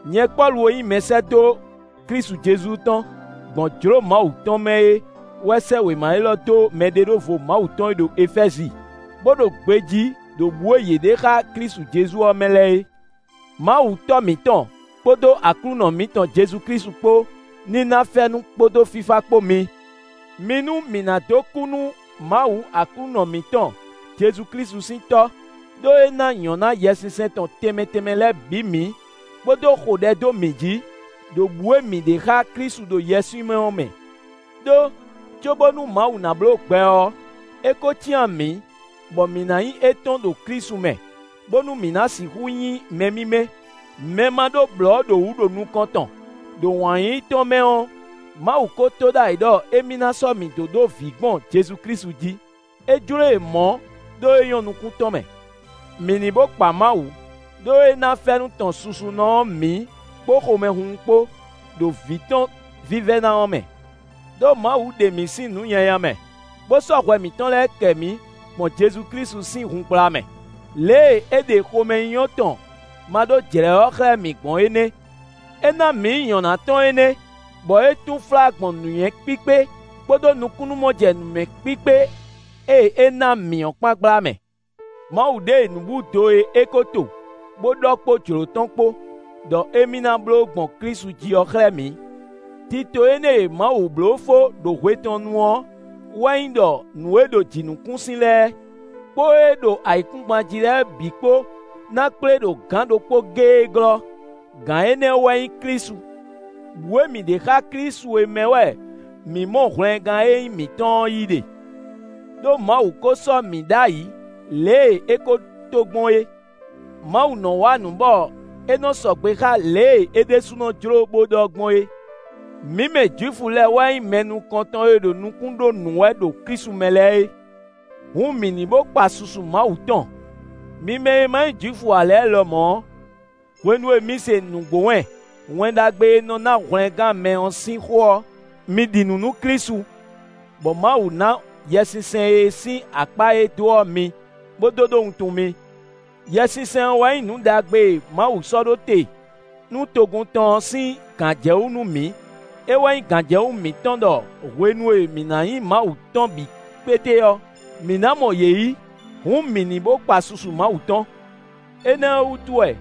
Nyɛ Pɔ́lu e nyí mɛsɛ́dó Klísu Jezu tɔn gbɔn jlǒ Mawu tɔn mɛ é wɛ sɛ́ wěma élɔ́ dó mɛɖeɖóvo Mawu tɔn e ɖo Efɛ́zi, bó ɖo gbejí ɖo bǔ e yě ɖe xá Klísu Jezu ɔ́ mɛ lɛ́ɛ é. Mawu Tɔ́ mǐtɔn kpódó Aklúnɔ mǐtɔn Jezu Klísu kpó ní ná fɛ́nú kpódó fífá kpó mi. Mi nú mǐ ná dó kú nú Mawu Aklúnɔ mǐtɔn Jezu Klísu sín Tɔ́, ɖó é ná nyɔ̌ná Yɛsinsɛn tɔn tɛnmɛ tɛnmɛ lɛ́ɛ bǐ mǐ, bó dó xo ɖɛ dó mǐ jí, ɖo bǔ e mǐ ɖe xá Klísu ɖo yɛswímɛ ɔ́ mɛ. Đó, cóbónú Mawu ná bló gbɛ ɔ́, é ko cyán mǐ, bɔ mǐ ná nyí étɔn ɖo Klísu mɛ, bónú mǐ ná sixú nyí mɛ mímɛ́, mɛ ma ɖó blɔ̌ ɖo wǔ ɖo nukɔn tɔn; ɖo wǎn yíyí tɔn mɛ ɔ́, Mawu ko to ɖ'ayǐ ɖɔ émí ná sɔ́ mǐ dó ɖó vǐ gbɔn Jezu Klísu jí. É jló e mɔ̌ ɖó é nyɔ́ nukún tɔn mɛ. Mǐ ní bó kpa Mawu, ɖó é ná fɛ́nú tɔn susunɔ ɔ́ mǐ kpó xomɛhunhun kpó, ɖo Vǐ tɔn vívɛ́ná ɔ́ mɛ. Đó Mawu ɖe mǐ sín nǔ nyanya mɛ, bó sɔ́ hwɛ mǐtɔn lɛ́ɛ kɛ mǐ gbɔn Jezu Klísu sín hun gbla mɛ. Lě e é ɖe xomɛnyínyɔ́ tɔn maɖójlɛ̌ ɔ́ xlɛ́ mǐ gbɔn é nɛ́. É ná mǐ nyɔ̌ná tɔn énɛ́ bɔ é túnflá gbɔn nǔnywɛ́ kpíkpé kpódó nukúnnú-mɔjɛnǔmɛ kpíkpé e é ná mǐ ɔ́ kpán gbla mɛ. Mawu ɖe nǔbúdo e é ko to, bó ɖɔ kpó jlǒ tɔn kpó ɖɔ émí ná bló gbɔn Klísu jí ɔ́ xlɛ́ mǐ. Tito énɛ́ e Mawu bló fó ɖo hwe tɔn nu ɔ́ wɛ nyí ɖɔ nǔ e ɖo jǐnukúnsin lɛ́ɛ, kpó ée ɖo ayǐkúngban jí lɛ́ɛ bǐ kpó ná kplé ɖo gǎn ɖokpó géé glɔ́; Gǎn énɛ́ wɛ nyí Klísu. Bǔ e mǐ ɖe xá Klísu é mɛ wɛ mǐ mɔ hwlɛngán e nyí mǐtɔn ɔ́ yí ɖe; ɖó Mawu ko sɔ́ mǐ ɖ'ayǐ lě e é ko to gbɔn é; Mawu nɔ́ wa nǔ bɔ é nɔ sɔgbe xá lě e é ɖésúnɔ jló bó ɖɔ gbɔn é. Mǐ mɛ Jwifu lɛ́ɛ wɛ nyí mɛ nukɔntɔn e ɖo nukún ɖó nǔ wɛ ɖo Klísu mɛ lɛ́ɛ é; hǔn mǐ ní bó kpa susu Mawu tɔn. Mi mɛ e ma nyí Jwifu ǎ lɛ́ɛ lɔmɔ̌ ɔ́, hwenu e mi se nǔgbó wɛn, Wɛn Ɖagbe e nɔ ná hwlɛngán mɛ ɔ́ sín xó ɔ́, mi ɖi nǔ nú Klísu, bɔ Mawu ná Yɛsinsɛn e sín akpá e é dó ɔ́ mi, bó dó ɖó wuntun mi. Yɛsinsɛn ɔ́ wɛ nyí nǔ ɖagbe e Mawu sɔ́ ɖó te nú togun tɔn ɔ́ sín gǎnjɛwú nú mǐ. É wɛ nyí gǎnjɛwú mǐtɔn ɖɔ hwenu e mǐ ná nyí Mawu tɔn bǐ kpéte ɔ́, mǐ ná mɔ yě yí. Hǔn mǐ ní bó kpa susu Mawu tɔn. Énɛ́ ɔ́ wútu wɛ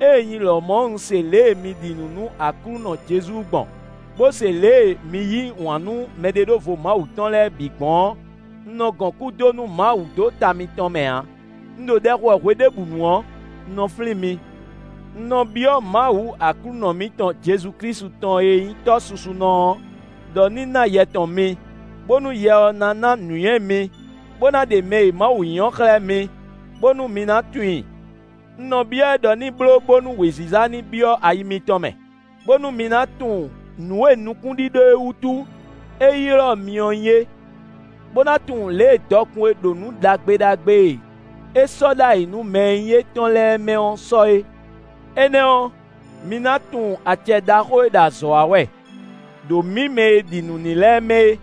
ée nyi lɔmɔ̌ un se lě e mi ɖi nǔ nú Aklúnɔ Jezu gbɔn, bó se lě e mi yí wǎn nú mɛɖeɖóvo Mawu tɔn lɛ́ɛ bǐ gbɔn ɔ́, un nɔ gɔn kú dó nú Mawu dó ta mitɔn mɛ ǎ. Un ɖo ɖɛ xo wɛ hweɖěbǔnu ɔ́, un nɔ flín mi. Un nɔ byɔ́ Mawu Aklúnɔ mǐtɔn Jezu Klísu tɔn e nyí Tɔ́ susunɔ ɔ́ ɖɔ ní ná Yɛ tɔn mi, bónú Yɛ ɔ́ ná ná nǔnywɛ́ mi, bó ná ɖe mɛ e Mawu nyí ɔ́ xlɛ́ mi, bónú mi ná tunwun i. Un nɔ byɔ́ ɛ ɖɔ ní bló bónú wěziza ní byɔ́ ayi mitɔn mɛ, bónú mi ná tunwun nǔ e nukúnɖíɖó e wútu é ylɔ́ mi ɔ́ nyí é, bó ná tunwun lě e dɔkun e ɖo nǔ ɖagbe ɖagbe e é sɔ́ ɖ'ayǐ nú mɛ e nyí étɔn lɛ́ɛ mɛ ɔ́ sɔ́ é. Énɛ́ ɔ́, mi ná tunwun acɛ ɖaxó e ɖo azɔ̌ wa wɛ ɖo mǐ mɛ e ɖi nǔ n'i lɛ́ɛ mɛ é.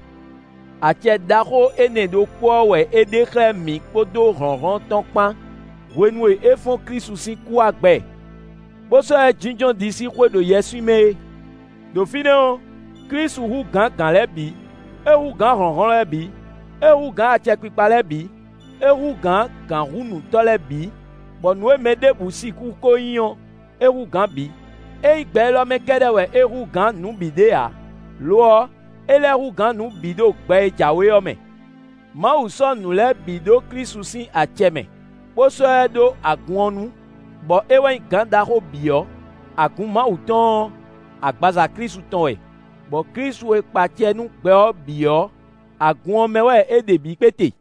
Acɛ ɖaxó énɛ́ ɖokpó ɔ́ wɛ é ɖe xlɛ́ mǐ kpódó hlɔ̌nhlɔ́n tɔn kpán hwenu e é fɔ́n Klísu sín kú wá gbɛ, bó sɔ́ ɛ jínjɔ́n ɖisíxwé ɖo yɛswímɛ é. Đo fínɛ́ ɔ́, Klísu hú gǎn gǎn lɛ́ɛ bǐ; é hú gǎn hlɔ̌nhlɔ́n lɛ́ɛ bǐ; é hú gǎn acɛkpikpa lɛ́ɛ bǐ; é hú gǎn gǎnhúnǔtɔ́ lɛ́ɛ bǐ, bɔ nǔ e mɛ ɖěbǔ ko sixú nyí ɔ́, é hú gǎn bǐ; é nyí gbɛ élɔ́ mɛ kɛ́ɖɛ́ wɛ é hú gǎn nǔ bǐ ɖe ǎ; lo ɔ́, é lɛ́ hú gǎn nǔ bǐ ɖo gbɛ e jǎwe ɔ́ mɛ. Mawu sɔ́ nǔ lɛ́ɛ bǐ ɖó Klísu sín acɛ mɛ, bó sɔ́ ɛ ɖó agun ɔ́ nú, bɔ é wɛ nyí gǎn ɖaxó bǐ ɔ́. Agun Mawu tɔn ɔ́, agbaza Klísu tɔn wɛ, bɔ Klísu e kpa acɛ nú gbɛ ɔ́ bǐ ɔ́, agun ɔ́ mɛ wɛ é ɖe bǐ kpéte.